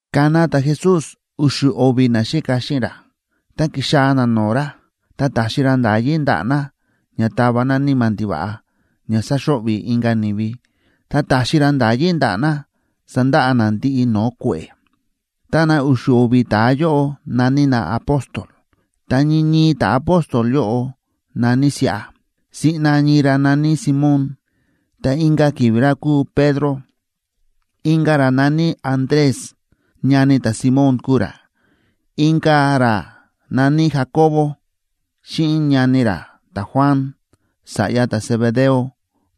Ka̱na ta̱Jesús u̱xu̱ o̱vi̱ naxíka xíꞌin ra, ta ki̱xaa̱ na no̱o̱ ra, ta ta̱xi ra nda̱yí ndaꞌa̱ na ña tava na níma̱ ndiva̱ꞌa ña sáxo̱ꞌvi̱ inka̱ ni̱vi, ta ta̱xi ra nda̱yí ndaꞌa̱ na sandaꞌa na ndiꞌi no̱o̱ kue̱ꞌe̱. Ta na u̱xu̱ o̱vi̱ ta̱a yóꞌo na̱ní na apóstol.a Ta ñii ñii ta̱apóstol yóꞌo na̱ní siꞌa: siꞌna ñii ra na̱ní Simón ta inka̱ ki̱vi̱ ra kúu Pedro; inka̱ ra na̱ní Andrés, ñani ta̱Simón kúu ra; inka̱ ra na̱ní Jacobo, xíꞌin ñani ra ta̱Juan, sa̱ꞌya ta̱Zebedeo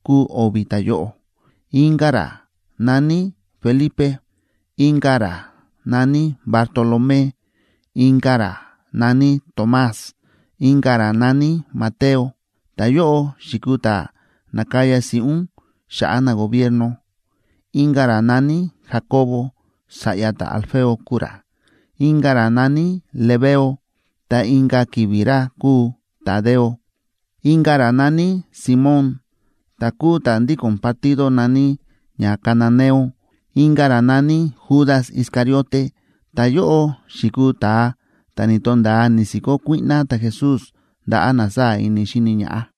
kúu o̱vi̱ ta̱yóꞌo; inka̱ ra na̱ní Felipe; inka̱ ra na̱ní Bartolomé; inka̱ ra na̱ní Tomás; inka̱ ra na̱ní Mateo, ta̱yóꞌo xi̱kuu ta̱ na̱kaya si̱ꞌún xa̱ꞌa̱ nagobierno; inka̱ ra na̱ní Jacobo, sa̱ꞌya ta̱Alfeo kúu ra; inka̱ ra na̱ní Lebeo ta inka̱ ki̱vi̱ ra kúu Tadeo; inka̱ ra na̱ní Simón, ta̱ kúu ta̱ ndíko̱n partido na̱ní ña cananeo; inka̱ ra na̱ní Judas Iscariote. Ta̱yóꞌo xi̱kuu ta̱a ta̱ ni̱to̱nda̱a ni̱si̱kó kuíꞌná ta̱Jesús ndaꞌa̱ na sáa̱ ini xíni ñaꞌá.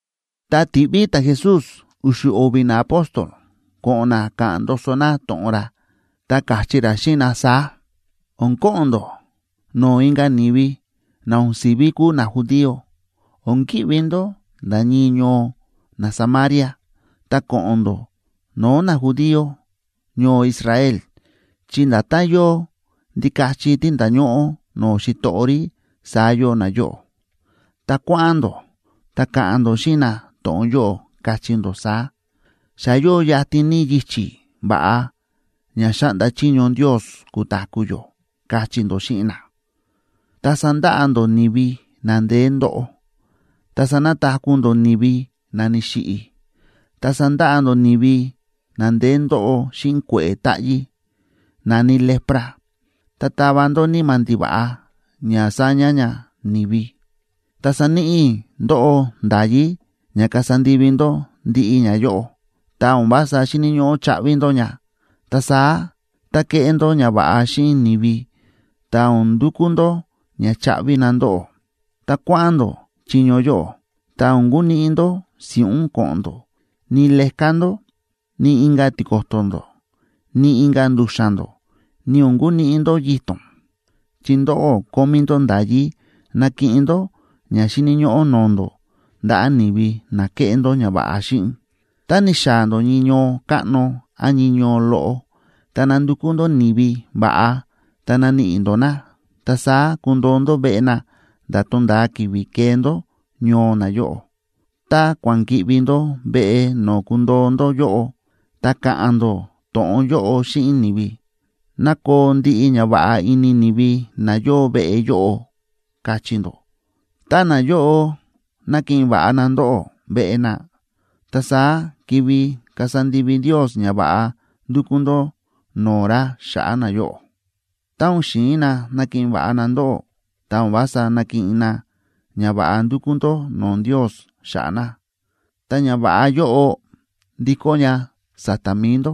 Ta ti̱ꞌví ta̱Jesús u̱xu̱ o̱vi̱ naapóstol ko̱ꞌo̱n na ka̱ꞌa̱n ndoso na to̱ꞌon ra, ta káchí ra xíꞌin na saá: ―O̱n ko̱ꞌo̱n ndó no̱o̱ inka̱ ni̱vi na o̱n si̱ví kúu najudío, o̱n ki̱ꞌvi ndó nda̱ ñii ñoo naSamaria. Ta ko̱ꞌo̱n ndó no̱o̱ najudío ñoo Israel, chi nda̱tán yóo ndikachi tí nda̱ñóꞌó no̱o̱ xitoꞌo rí, saá yóo nayóꞌo. Tá kua̱ꞌa̱n ndó, ta ka̱ꞌa̱n ndó xíꞌin na to̱ꞌon yóꞌo, kachí ndó saá: “Xa yóo yatin ní yichi̱ va̱ꞌa ña xáꞌnda chiño Ndios kutaku̱ yó”, kachí ndó xíꞌin na. Ta sandaꞌa ndó ni̱vi na ndeé ndóꞌo, ta sanataku̱ ndó ni̱vi na ni̱xiꞌi̱, ta sandaꞌa ndó ni̱vi na ndeé ndóꞌo xíꞌin kue̱ꞌe̱ táꞌyí na̱ní lepra, ta tava ndó níma̱ ndiva̱ꞌa ña saña ña ni̱vi. Ta sa̱níꞌi i̱ ndóꞌó nda̱yí ña kasa ndivi ndó ndiꞌi ñayóꞌo, ta o̱n vása xi̱ni̱ ñóꞌó chaꞌvi ndó ña. Ta saá, tá keꞌé ndó ñava̱ꞌa xíꞌin ni̱vi, ta o̱n ndukú ndó ña chaꞌvi na ndóꞌó. ’Tá kua̱ꞌa̱n ndó chiño yóꞌo, ta o̱n kuniꞌi ndó si̱ꞌún ko̱ꞌo̱n ndó, ni leká ndó, ni inka̱ tiko̱to̱ ndó, ni inka̱ ndu̱xa̱n ndó, ni o̱n kuniꞌi ndó yito̱n.b Chi ndóꞌó kómí ndó nda̱yí nakiꞌin ndó ña xíni̱ ñóꞌó no̱o̱ ndó, ndaꞌa̱ ni̱vi na keꞌé ndó ñava̱ꞌa xíꞌin. ’Tá ni̱xaa̱ ndó ñii ñoo káꞌno án ñii ñoo loꞌo, ta nandukú ndó ni̱vi va̱ꞌa; tá naníꞌi ndó na, ta saá kundoo ndó veꞌe na nda̱ tonda̱a ki̱vi̱ kee ndó ñoo nayóꞌo. Tá kua̱ꞌa̱n ki̱ꞌvi ndó veꞌe no̱o̱ kundoo ndó yóꞌo, ta ka̱ꞌa̱n ndó to̱ꞌon yóꞌo xíꞌin ni̱vi: “Ná koo ndiꞌi ñava̱ꞌa ini ni̱vi na yóo veꞌe yóꞌo”, kachí ndó. Tá nayóꞌo nakiꞌin va̱ꞌa na ndóꞌó veꞌe na, ta saá kivi kasa ndivi Ndios ñava̱ꞌa ndu̱kú ndó no̱o̱ ra xa̱ꞌa̱ nayóꞌo. Tá o̱n xi̱in na nakiꞌin va̱ꞌa na ndóꞌó, ta o̱n vása nakiꞌin na ñava̱ꞌa ndu̱kú ndó no̱o̱ Ndios xa̱ꞌa̱ na, ta ñava̱ꞌa yóꞌo ndikó ña sa̱ta̱ mi̱i ndó.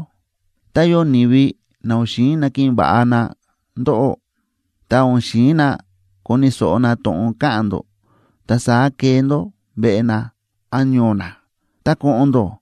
Tá yóo ni̱vi na o̱n xi̱in nakiꞌin va̱ꞌa na ndóꞌó, ta o̱n xi̱in na koni̱ so̱ꞌo na to̱ꞌon ka̱ꞌa̱n ndó, ta saá kee ndó veꞌe na án ñoo na, ta ko̱ꞌo̱n ndó,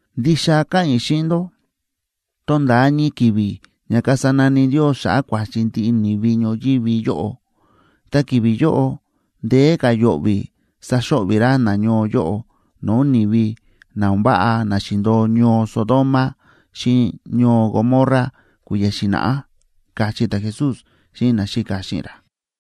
Ndixa káꞌa̱n i̱ xíꞌin ndó, tonda̱a ñii ki̱vi̱ ña kasa nani Ndios xa̱ꞌa̱ kua̱chi ndiꞌi ni̱vi ñoyívi yóꞌo, ta ki̱vi̱ yóꞌo ndeé ka̱ yo̱ꞌvi̱ saxo̱ꞌvi̱ ra nañoo yóꞌo no̱o̱ ni̱vi na o̱n váꞌa na xi̱ndo̱o ñoo Sodoma xíꞌin ñoo Gomorra kui̱ya̱ xi̱na̱ꞌá ―káchí ta̱Jesús xíꞌin naxíka xíꞌin ra.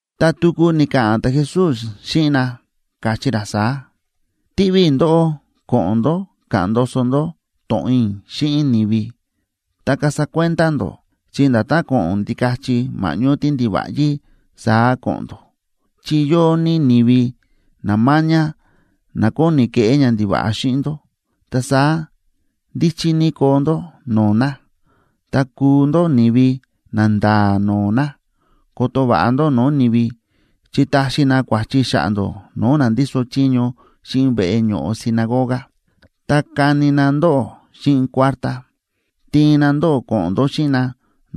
Ta tuku ni̱ka̱ꞌa̱n ta̱Jesús xíꞌin na, káchí ra saá: ―Tiꞌví i̱ ndóꞌó ko̱ꞌo̱n ndó ka̱ꞌa̱n ndoso ndó to̱ꞌon i̱ xíꞌin ni̱vi. Ta kasa kuenda ndó, chi nda̱tán ko̱ꞌo̱n ndikachi ma̱ꞌñó tíndiva̱ꞌyí saá ko̱ꞌo̱n ndó, chi yóo ní ni̱vi na máñá na kóni keꞌé ñandiva̱ꞌa xíꞌin ndó. Ta saá ndíchí ní koo ndó no̱o̱ na, ta kuu ndó ni̱vi nanda̱a̱ no̱o̱ na. Koto va̱ꞌa ndó no̱o̱ ni̱vi, chi taxi na kua̱chi xa̱ꞌa̱ ndó no̱o̱ na ndíso chiño xíꞌin veꞌe ño̱ꞌo sinagoga, ta kani na ndóꞌó xíꞌin kuártá. Tiin na ndóꞌó ko̱ꞌo̱n ndó xíꞌin na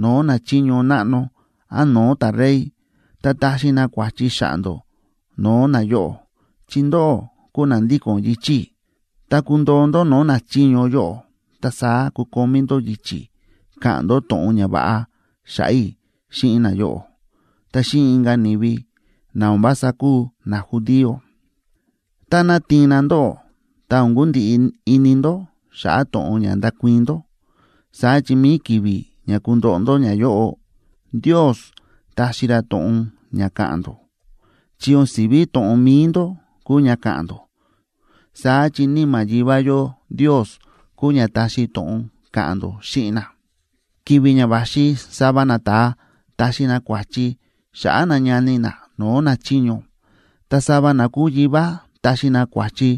no̱o̱ nachiño náꞌno án no̱o̱ ta̱rey, ta taxi na kua̱chi xa̱ꞌa̱ ndó no̱o̱ nayóꞌo, chi ndóꞌó kúu na ndíko̱n yichi̱ i̱. Tá kundoo ndó no̱o̱ nachiño yóꞌo, ta saá kukomí ndó yichi̱ ka̱ꞌa̱n ndó to̱ꞌon ñava̱ꞌa xa̱ꞌa̱ i̱ xíꞌin nayóꞌo ta xíꞌin inka̱ ni̱vi na o̱n vása kúu najudío. Táná tiin na ndóꞌó, ta o̱n kundiꞌi ini ndó xa̱ꞌa̱ to̱ꞌon ña ndakuii̱n ndó, saá chi mi̱i ki̱vi̱ ña kundoꞌo ndó ñayóꞌo, Ndios taxi ra to̱ꞌon ña ka̱ꞌa̱n ndó. Chi o̱n si̱ví to̱ꞌon mi̱i ndó kúu ña ka̱ꞌa̱n ndó, saá chi Níma̱ Yivá yó Ndios kúu ña taxi to̱ꞌon ka̱ꞌa̱n ndó xíꞌin na. ’Ki̱vi̱ ña va̱xi sava nata̱a taxi na kua̱chi xa̱ꞌa̱ ñani na no̱o̱ nachiño, ta sava na kúu yivá taxi na kua̱chi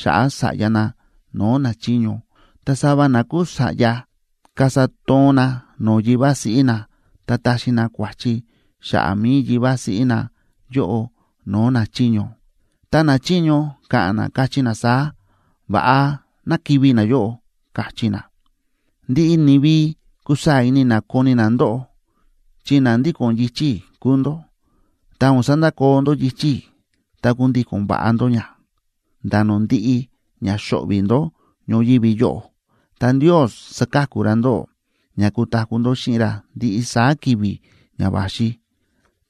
xa̱ꞌa̱ sa̱ꞌya na no̱o̱ nachiño. Ta sava na kúu sa̱ꞌya kasa toon na no̱o̱ yivá siꞌí na, ta taxi na kua̱chi xa̱ꞌa̱ mi̱i yivá siꞌí na yóꞌo no̱o̱ nachiño, ta nachiño ka̱ꞌa̱n na, kachí na saá: “Va̱ꞌa, ná kivi̱ nayóꞌo”, kachí na. Ndiꞌi ni̱vi kusaa̱ ini na koni na ndóꞌó chi na ndíko̱n yichi̱ i̱ kúu ndó. Tá o̱n sandakoo ndó yichi̱ i̱ ta kundíko̱n va̱ꞌa ndó ña, nda̱ no̱o̱ ndi̱ꞌi ña xo̱ꞌvi̱ ndó ñoyívi yóꞌo, ta Ndios saka̱ku ra ndóꞌó ña kutaku̱ ndó xíꞌin ra ndiꞌi saá ki̱vi̱ ña va̱xi.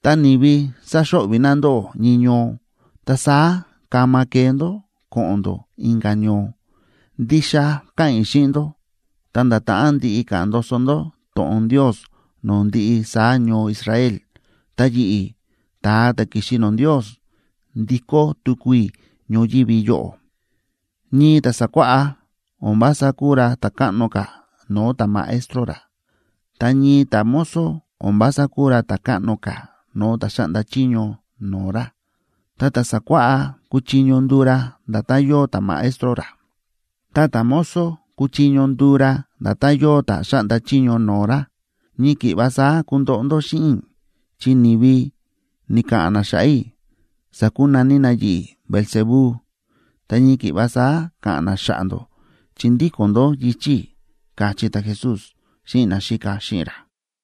Tá ni̱vi saxo̱ꞌvi̱ na ndóꞌó ñii ñoo, ta saá kama kee ndó ko̱ꞌo̱n ndó inka̱ ñoo. Ndixa káꞌa̱n i̱ xíꞌin ndó, ta nda̱ ta̱ꞌán ndiꞌi ka̱ꞌa̱n ndoso ndó to̱ꞌon Ndios no̱o̱ ndiꞌi saá ñoo Israel, ta yi̱ꞌi̱, ta̱a ta̱ ki̱xi no̱o̱ Ndios, ndikó tuku i̱ ñoyívi yóꞌo. ’Ñii ta̱ sákuáꞌá, o̱n vása kúu ra ta̱ káꞌno ka̱ no̱o̱ ta̱maestro ra, ta ñii ta̱mozo o̱n vása kúu ra ta̱ káꞌno ka̱ no̱o̱ ta̱ xáꞌnda chiño no̱o̱ ra. Ta ta̱ sákuáꞌá kúchiño nduu ra nda̱tán yóo ta̱maestro ra, ta ta̱mozo kúchiño nduu ra nda̱tán yóo ta̱ xáꞌnda chiño no̱o̱ ra. Ñii ki̱ꞌva saá kundoꞌo ndó xíꞌin i̱ chi ni̱vi ni̱ka̱ꞌa̱n na xa̱ꞌa̱ i̱, sa̱kunaní na yi̱ꞌi̱ Beelzebú,d ta ñii ki̱ꞌva saá ka̱ꞌa̱n na xa̱ꞌa̱ ndó, chi ndíko̱n ndó yichi̱ i̱ ―káchí ta̱Jesús xíꞌin naxíka xíꞌin ra.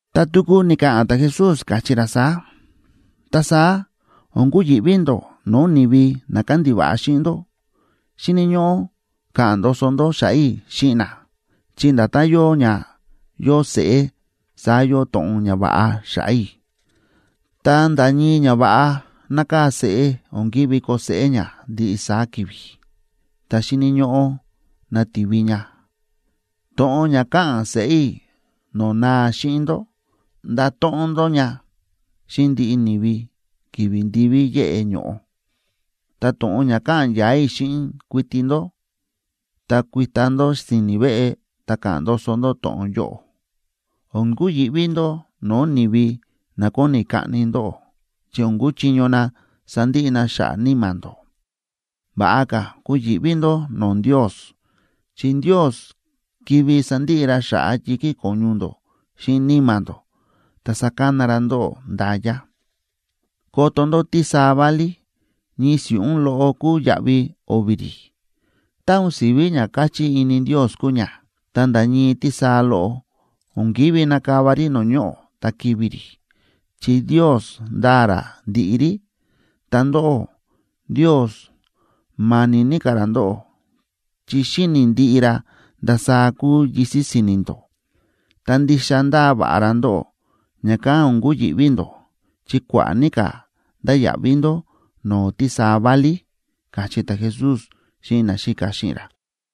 Ta tuku ni̱ka̱ꞌa̱n ta̱Jesús, káchí ra saá: ―Ta saá o̱n kuyi̱ꞌví ndó no̱o̱ ni̱vi na kándiva̱ꞌa xíꞌin ndó. Xíni̱ ñóꞌó ka̱ꞌa̱n ndoso ndó xa̱ꞌa̱ i̱ xíꞌin na, chi nda̱tán yóo ña yóo seꞌé, saá yóo to̱ꞌon ñava̱ꞌa xa̱ꞌa̱ i̱. Ta nda̱ ñii ñava̱ꞌa nákaa̱ seꞌé o̱n ki̱ví koo seꞌé ña ndiꞌi saá ki̱vi̱, ta xíni̱ ñóꞌó nativi ña. To̱ꞌon ña káꞌa̱n seꞌé i̱ no̱o̱ naa xíꞌin ndó, ndato̱ꞌon ndó ña xíꞌin ndiꞌi ni̱vi ki̱vi̱ ndiví yéꞌe ño̱ꞌo; ta to̱ꞌon ña káꞌa̱n ya̱a̱ i̱ xíꞌin kuiti ndó, ta kuita ndó si̱ni̱ veꞌe ta ka̱ꞌa̱n ndoso ndó to̱ꞌon yóꞌo. O̱n kuyi̱ꞌví ndó no̱o̱ ni̱vi na kóni kaꞌni ndóꞌó, chi o̱n kuchiño na sandiꞌi na xa̱ꞌa̱ níma̱ ndó. Va̱ꞌa ka̱ kuyi̱ꞌví ndó no̱o̱ Ndios, chi Ndios kivi sandiꞌi ra xa̱ꞌa̱ yi̱kí ko̱ñu ndó xíꞌin níma̱ ndó, ta sakana ra ndóꞌó nda̱ya. ’Koto ndó tísaa válí, ñii si̱ꞌún loꞌo kúu yaꞌvi o̱vi̱ rí. Tá o̱n si̱ví ña káchí ini Ndios kúu ña, ta nda̱ ñii tísaa loꞌo o̱n ki̱ví nakava rí no̱o̱ ñoꞌo̱ ta kivi̱ rí, chi Ndios ndáa ra ndiꞌi rí. Ta ndóꞌó, Ndios ma̱ni̱ ní ka̱ ra ndóꞌó, chi xíni̱ ndiꞌi ra ndasaá kúu yisi̱ si̱ni̱ ndó. Ta ndixa ndáa va̱ꞌa ra ndóꞌó, ña̱kán o̱n kuyi̱ꞌví ndó, chi kua̱ꞌa̱ ní ka̱ ndáya̱ꞌví ndó no̱o̱ tísaa válí ―káchí ta̱Jesús xíꞌin naxíka xíꞌin ra.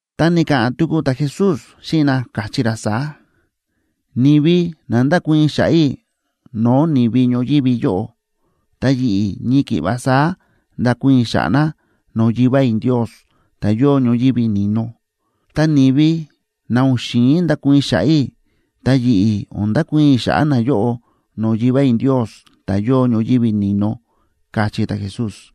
Ta ni̱ka̱ꞌa̱n tuku ta̱Jesús xíꞌin na, káchí ra saá: ―Ni̱vi na ndákuii̱n xa̱ꞌa̱ i̱ no̱o̱ ni̱vi ñoyívi yóꞌo, ta yi̱ꞌi̱ ñii ki̱ꞌva saá ndakuii̱n i̱ xa̱ꞌa̱ na no̱o̱ Yivá i̱ Ndios, ta̱ yóo ñoyívi ni̱no. Ta ni̱vi na o̱n xi̱in ndakuii̱n xa̱ꞌa̱ i̱, ta yi̱ꞌi̱ o̱n ndakuii̱n i̱ xa̱ꞌa̱ nayóꞌo no̱o̱ Yivá i̱ Ndios, ta̱ yóo ñoyívi ni̱no ―káchí ta̱Jesús.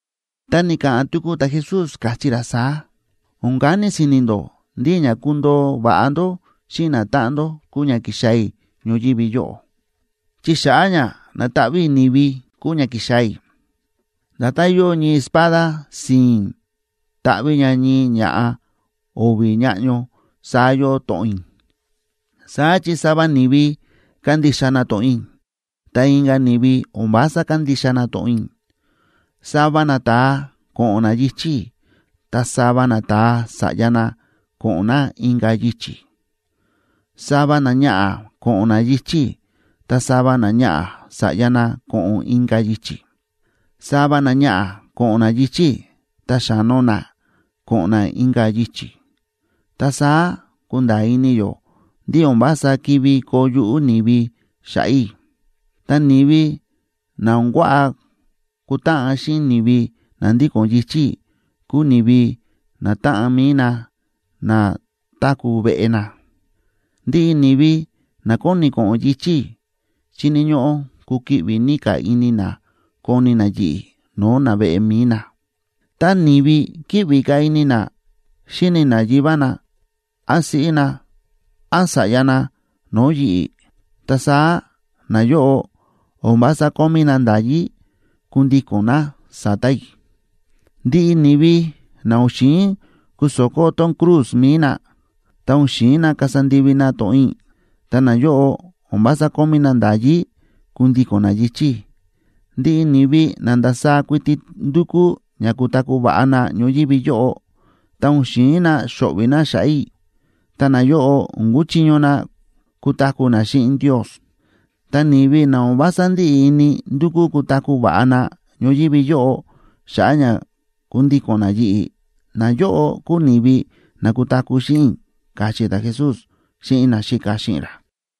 Ta ni̱ka̱ꞌa̱n tuku ta̱Jesús, káchí ra saá: ―O̱n kani si̱ni̱ ndó ndí ña kundoo va̱ꞌa ndó xíꞌin natáꞌan ndó, kúu ña ki̱xaa̱ i̱ ñoyívi yóꞌo, chi xa̱ꞌa̱ ña nataꞌví i̱ ni̱vi kúu ña ki̱xaa̱ i̱. Nda̱tán yóo ñii espada si̱i̱n táꞌví ña ñii ña̱ꞌa o̱vi̱ ñáꞌño, saá yóo to̱ꞌon i̱. Saá chi sava ni̱vi kándixa na to̱ꞌon i̱, ta inka̱ ni̱vi o̱n vása kándixa na to̱ꞌon i̱. Sava nata̱a ko̱ꞌo̱n na yichi̱ i̱, ta sava nata̱a sa̱ꞌya na ko̱ꞌo̱n na inka̱ yichi̱. Sava náñaꞌa̱ ko̱ꞌo̱n ná yichi̱ i̱, ta sava náñaꞌa̱ sa̱ꞌya ná ko̱ꞌo̱n ná inka̱ yichi̱. Sava náñaꞌa̱ ko̱ꞌo̱n ná yichi̱ i̱, ta xa̱no ná ko̱ꞌo̱n ná inka̱ yichi̱. Ta saá kunda̱a̱ ini yó ndí o̱n vása kivi koo yuꞌú ni̱vi xa̱ꞌa̱ i̱. Ta ni̱vi na o̱n kuaꞌa kutáꞌan xíꞌin ni̱vi na ndíko̱n yichi̱ i̱, kuu ni̱vi natáꞌan mi̱i na na táku̱ veꞌe na. ’Ndiꞌi ni̱vi na kóni ko̱ꞌo̱n yichi̱ i̱, xíni̱ ñóꞌó kukiꞌvi ní ka̱ ini na koni na yi̱ꞌi̱ no̱o̱ naveꞌe mi̱i na. Tá ni̱vi kíꞌvi ka̱ ini na xíni na yivá na, án siꞌí na, án sa̱ꞌya na no̱o̱ yi̱ꞌi̱, ta saá nayóꞌo o̱n vása kómí na nda̱yí kundíko̱n na sa̱ta̱ i̱. Ndiꞌi ni̱vi na o̱n xi̱in kuso̱kó tón cruz mi̱i na,e ta o̱n xi̱in na kasa ndivi na to̱ꞌon i̱, ta nayóꞌo o̱n vása kómí na nda̱yí kundíko̱n na yichi̱ i̱. Ndiꞌi ni̱vi na ndasaá kuiti ndúkú ña kutaku̱ va̱ꞌa na ñoyívi yóꞌo, ta o̱n xi̱in na xo̱ꞌvi̱ na xa̱ꞌa̱ i̱, ta nayóꞌo o̱n kuchiño na kutaku̱ na xíꞌin Ndios. Ta ni̱vi na o̱n vása ndíꞌi ini ndukú kutaku̱ va̱ꞌa na ñoyívi yóꞌo, xa̱ꞌa̱ ña kundíko̱n na yi̱ꞌi̱, nayóꞌo kúu ni̱vi na kutaku̱ xíꞌin i̱ ―káchí ta̱Jesús xíꞌin naxíka xíꞌin ra.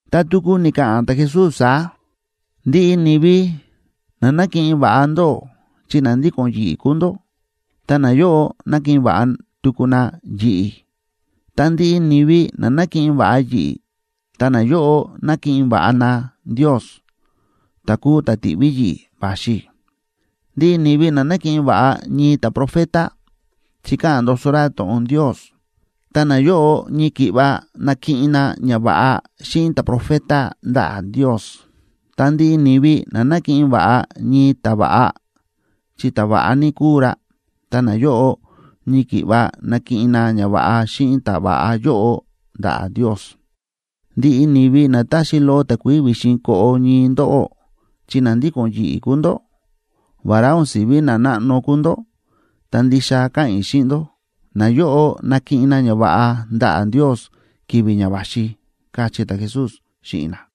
Ta tuku ni̱ka̱ꞌa̱n ta̱Jesús saá: ―Ndiꞌi ni̱vi na nákiꞌin va̱ꞌa ndóꞌó, chi na ndíko̱n yi̱ꞌi̱ kúu ndó, ta nayóꞌo nákiꞌin va̱ꞌa tuku na yi̱ꞌi̱. Ta ndiꞌi ni̱vi na nákiꞌin va̱ꞌa yi̱ꞌi̱, ta nayóꞌo nákiꞌin va̱ꞌa na Ndios, ta̱ kúu ta̱ ti̱ꞌví yi̱ꞌi̱ va̱xi i̱. Ndiꞌi ni̱vi na nákiꞌin va̱ꞌa ñii ta̱profeta, chi káꞌa̱n ndoso ra to̱ꞌon Ndios, ta nayóꞌo ñii ki̱ꞌva nakiꞌin na ñava̱ꞌa xíꞌin ta̱profeta ndaꞌa̱ Ndios. Ta ndiꞌi ni̱vi na nákiꞌin va̱ꞌa ñii ta̱va̱ꞌa, chi ta̱va̱ꞌa ní kúu ra, ta nayóꞌo ñii ki̱ꞌva nakiꞌin na ñava̱ꞌa xíꞌin ta̱va̱ꞌa yóꞌo ndaꞌa̱ Ndios. Ndiꞌi ni̱vi na táxi loꞌo takuií vi̱xin koꞌo ñii ndóꞌó, chi na ndíko̱n yi̱ꞌi̱ kúu ndó, vará o̱n si̱ví nanáꞌno kúu ndó, ta ndixa káꞌa̱n i̱ xíꞌin ndó, nayóꞌo nakiꞌin na ñava̱ꞌa ndaꞌa̱ Ndios ki̱vi̱ ña va̱xi ―káchí ta̱Jesús xíꞌin na.